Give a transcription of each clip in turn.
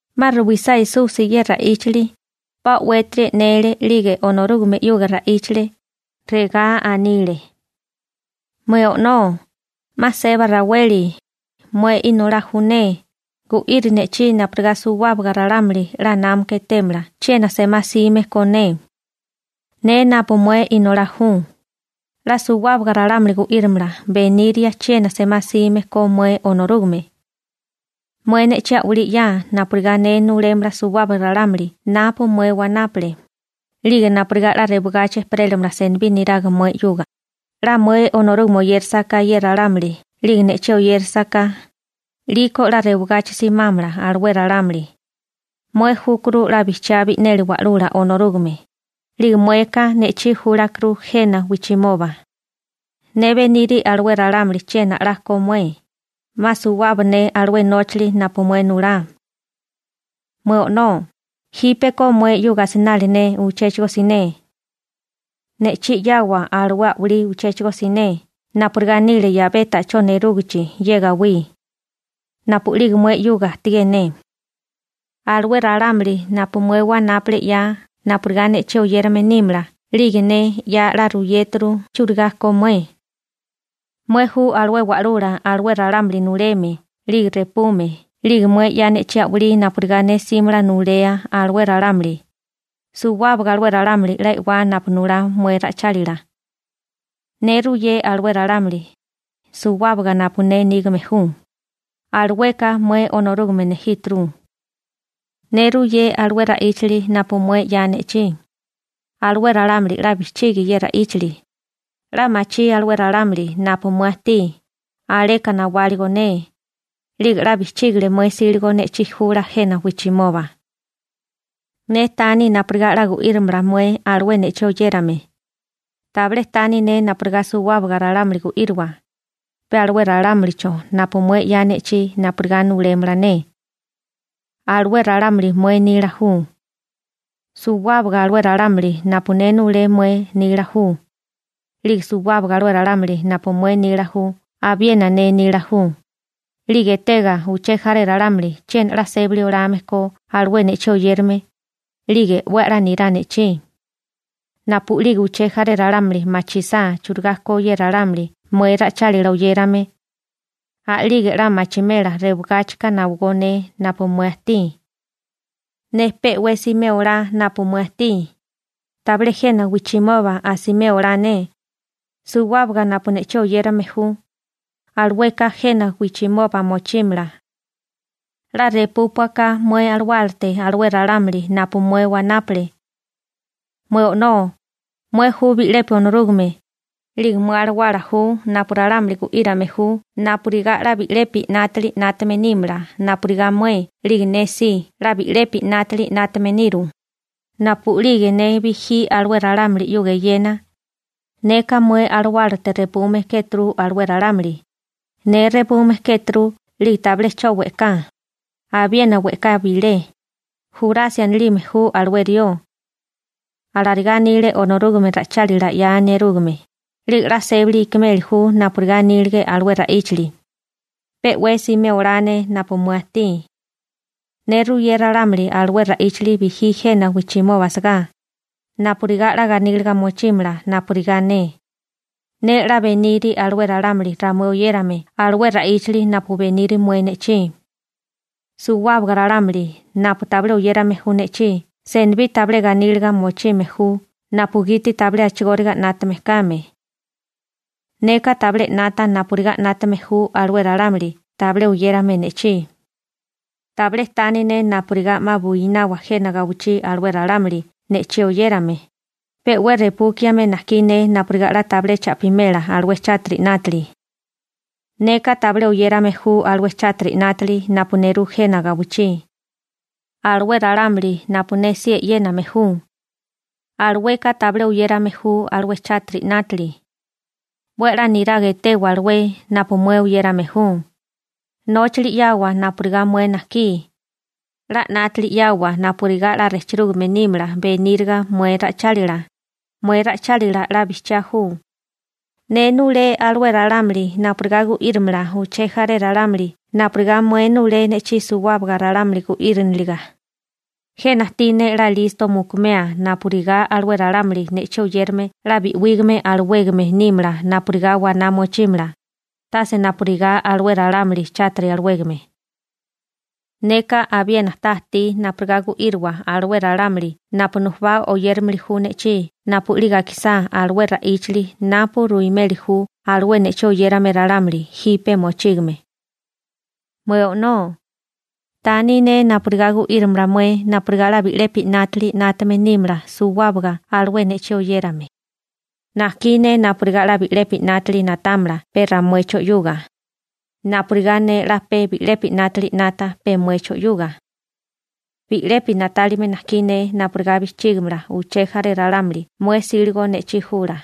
'Ma ruwisá Esusi ye ra'íchali, pa o'wétiri e'nele 'lige Onorúgame 'yuga ra'íchale, regá anile: ―Mué O'nó, 'ma seba raweli, mué Inolá ju ne, gu'iri ne'chí napurigá suwábaga ralámuli 'la námaka etémala chiena semá 'sime ko ne. Ne napu mué Inolá ju, 'la suwábaga ralámuli gu'írimala beniria chiena semá 'sime ko mué Onorúgame. Mué ne'chí a'walí 'ya napurigá ne nulémala suwábaga ralámuli napu mué wanápale, 'lige napurigá 'la rewagachi ejperélamala senibí niraga mué 'yuga. 'La mué Onorúgame oyérasaká ye ralámuli 'lige ne'chí oyérasaká, 'liko 'la rewagachi simámala alué ralámuli. Mué júkuru 'la bijchiá bi'neli Wa'lula Onorúgame, 'lige mueka ne'chí júlakuru jena wijchimoba. › Ne beniri alué ralámuli chiena a'lá ko mué, 'ma suwaba ne alué nóchali napu mué nulá. Mué O'nó, jípeko mué 'yuga asinali ne uchéchigo siné. Ne'chí 'yawa alué a'walí uchéchigo siné napurigá nile 'yabé ta'chó nerúgichi ye gawí, napu'lige mué 'yuga ajtigé ne. › Alué ralámuli napu mué wanápale 'ya napurigá ne'chí oyérame nímala 'lige ne 'la ruyéturu chieri ka mué. Mué ju alué Wa'lula alué ralámuli nuleme 'lige repume 'lige mué 'ya ne'chí a'walí napurigá ne 'símala nulea alué ralámuli. Suwábaga alué ralámuli 'la e'wá napu nulá mué ra'ichálila. Ne ruyé alué ralámuli, suwábaga napu ne nígame ju, alueka mué Onorúgame nejíturu. Ne ruyé alué ra'íchali napu mué 'ya ne'chí, alué ralámuli 'la bijchigi ye ra'íchali. 'La machí alué ralámuli napu mué ajtí, aleka nawáligo ne. 'Lige 'la bijchígile mué 'síligo ne'chí jula jena wijchimoba. › Ne taní napurigá 'la gu'írimala mué alué ne'chí oyérame. Tabilé taní ne napurigá suwábaga ralámuli gu'írowa, pe alué ralámulicho napu mué 'ya ne'chí napurigá nulémala ne. Alué ralámuli mué nila ju. Suwábaga alué ralámuli napu ne nulé mué nila ju, 'lige suwábaga alué ralámuli napu mué nila ju abiena ne nila ju, 'lige etega uché jaré ralámuli chiena 'la sébali olame ko alué ne'chí oyérame, 'lige 'we a'lá nirá ne'chí. Napu'lige uché jaré ralámuli machisá churigá ko ye ralámuli mué ra'ichálila oyérame, a'lige 'la machimela rewagáchika nawagó ne napu mué ajtí. › Ne pe'wé simé olá napu mué ajtí, tabilé jena wijchimoba asimé olá ne. Suwábaga napu ne'chí oyérame ju, alueka jena wijchimoba mochímala. 'La repúpuaka mué alawálate alué ralámuli napu mué wanápale. Mué O'nó, mué ju bi'lepi Onorúgame, 'lige mué alawala ju napu ralámuli gu'írame ju napurigá 'la bi'lepi 'nátili 'nátame nímala napurigá mué 'lige ne si 'la bi'lepi 'nátili 'nátame niru. Napu'lige ne bijí alué ralámuli 'yuga eyena, neka mué alawálate repume kéturu alué ralámuli. Ne repume kéturu 'lige tabilé 'cho we'ká, abiena we'ká bilé, Jurasi anilime ju alué rió. Alarigá anile Onorúgame ra'ichálila 'ya nerúgame, 'lige 'la sébali ikimeli ju napurigá anílige alué ra'íchali. › Pe 'we simé olá ne napu mué ajtí. Ne ruyé ralámuli alué ra'íchali bijí jena wijchimoba asagá, napurigá 'la ganíliga mochímala napurigá ne. Ne 'la beniri alué ralámuli ramué oyérame alué ra'íchali napu beniri mué ne'chí. Suwábaga ralámuli napu tabilé oyérame ju ne'chí senibí tabilé ganíliga mochime ju napugiti tabilé a'chigóriga 'nátame kame. Neka tabilé 'nata napurigá 'nátame ju alué ralámuli tabilé oyérame ne'chí. Tabilé taní ne napurigá 'ma buinawa jena gawichí alué ralámuli ne'chí oyérame, pe 'we repúkiame najkí ne napurigá 'la tabilé cha'pimela alué chátiri 'nátili. Neka tabilé oyérame ju alué chátiri 'nátili napu nerú jena gawichí, alué ralámuli napu ne si e'yéname ju, alueka tabilé oyérame ju alué chátiri 'nátili. 'We a'lá niraga etewa alué napu mué oyérame ju, nóchali 'yawa napurigá mué najkí. 'La 'nátili 'yawa napurigá 'la rejchirúgame nímala beníriga mué ra'ichálila. Mué ra'ichálila 'la bijchiá ju. Ne nulé alué ralámuli napurigá gu'írimala uché jaré ralámuli napurigá mué nulé ne'chí suwábaga ralámuli gu'íriniliga. Jena ajtí ne 'la listo mukumea napurigá alué ralámuli ne'chí oyérame 'la bi'wígame alawégame nímala napurigá waná mochímala, tase napurigá alué ralámuli chátiri alawégame. › Neka abiena ta ajtí napurigá gu'írowa alué ralámuli napu nujubá oyéramili ju ne'chí napu'lige akisá alué ra'íchali napu ruimeli ju alué ne'chí oyérame ralámuli jipe mochígame. Mué O'nó, taní ne napurigá gu'írimala mué napurigá 'la bi'lepi 'nátili 'nátame nímala suwábaga alué ne'chí oyérame. Najkí ne napurigá 'la bi'lepi 'nátili na'támala pe ramuecho 'yuga, napurigá ne 'la pe bi'lepi 'nátili 'nata pe muecho 'yuga. Bi'lepi na'tálime najkí ne napurigá bijchígimala uché jaré ralámuli mué 'síligo ne'chí jula.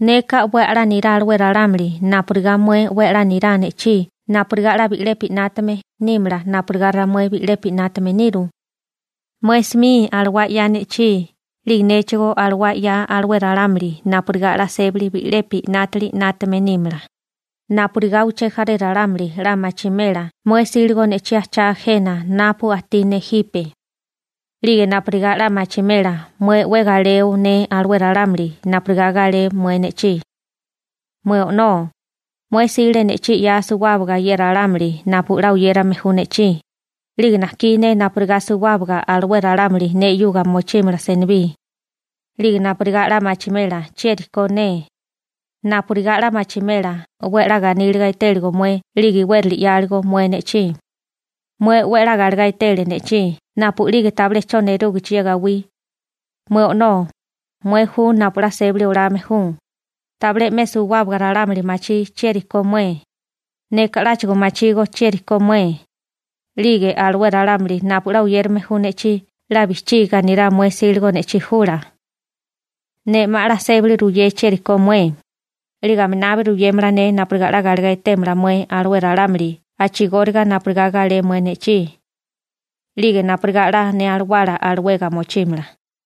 Neka 'we a'lá nirá alué ralámuli napurigá mué 'we a'lá nirá ne'chí napurigá 'la bi'lepi 'nátame nímala napurigá ramué bi'lepi 'nátame niru. Mué 'smi alawá 'ya ne'chí 'lige néchigó alawá 'ya alué ralámuli napurigá 'la sébali bi'lepi 'nátili 'nátame nímala, napurigá uché jaré ralámuli 'la machimela mué 'síligo ne'chí ajchá jena napu ajtí ne jipe, 'lige napurigá 'la machimela mué 'we galeo ne alué ralámuli napurigá galé mué ne'chí. › Mué O'nó, mué 'sile ne'chí 'ya suwábaga ye ralámuli napu 'la oyérame ju ne'chí, 'lige najkí ne napurigá suwábaga alué ralámuli ne 'yuga mochímala senibí, 'lige napurigá 'la machimela chieri ko ne, napurigá 'la machimela 'we a'lá ganíliga etéligo mué 'lige iwérali 'yáligo mué ne'chí. Mué 'we a'lá galegá etele ne'chí napu'lige tabilé 'cho nerúgichi ye gawí. Mué O'nó, mué ju napu 'la sébali olame ju. Tabilé 'me suwábaga ralámuli machí chieri ko mué, neka 'láchigo machígó chieri ko mué, 'lige alué ralámuli napu 'la oyérame ju ne'chí 'la bijchiga nirá mué 'síligo ne'chí jula. Ne 'ma 'la sébali ruyé chieri ko mué, 'lige aminabi ruyémala ne napurigá 'la galegá etémala mué alué ralámuli a'chigóriga napurigá galé mué ne'chí, 'lige napurigá 'la ne alawala alawega mochímala.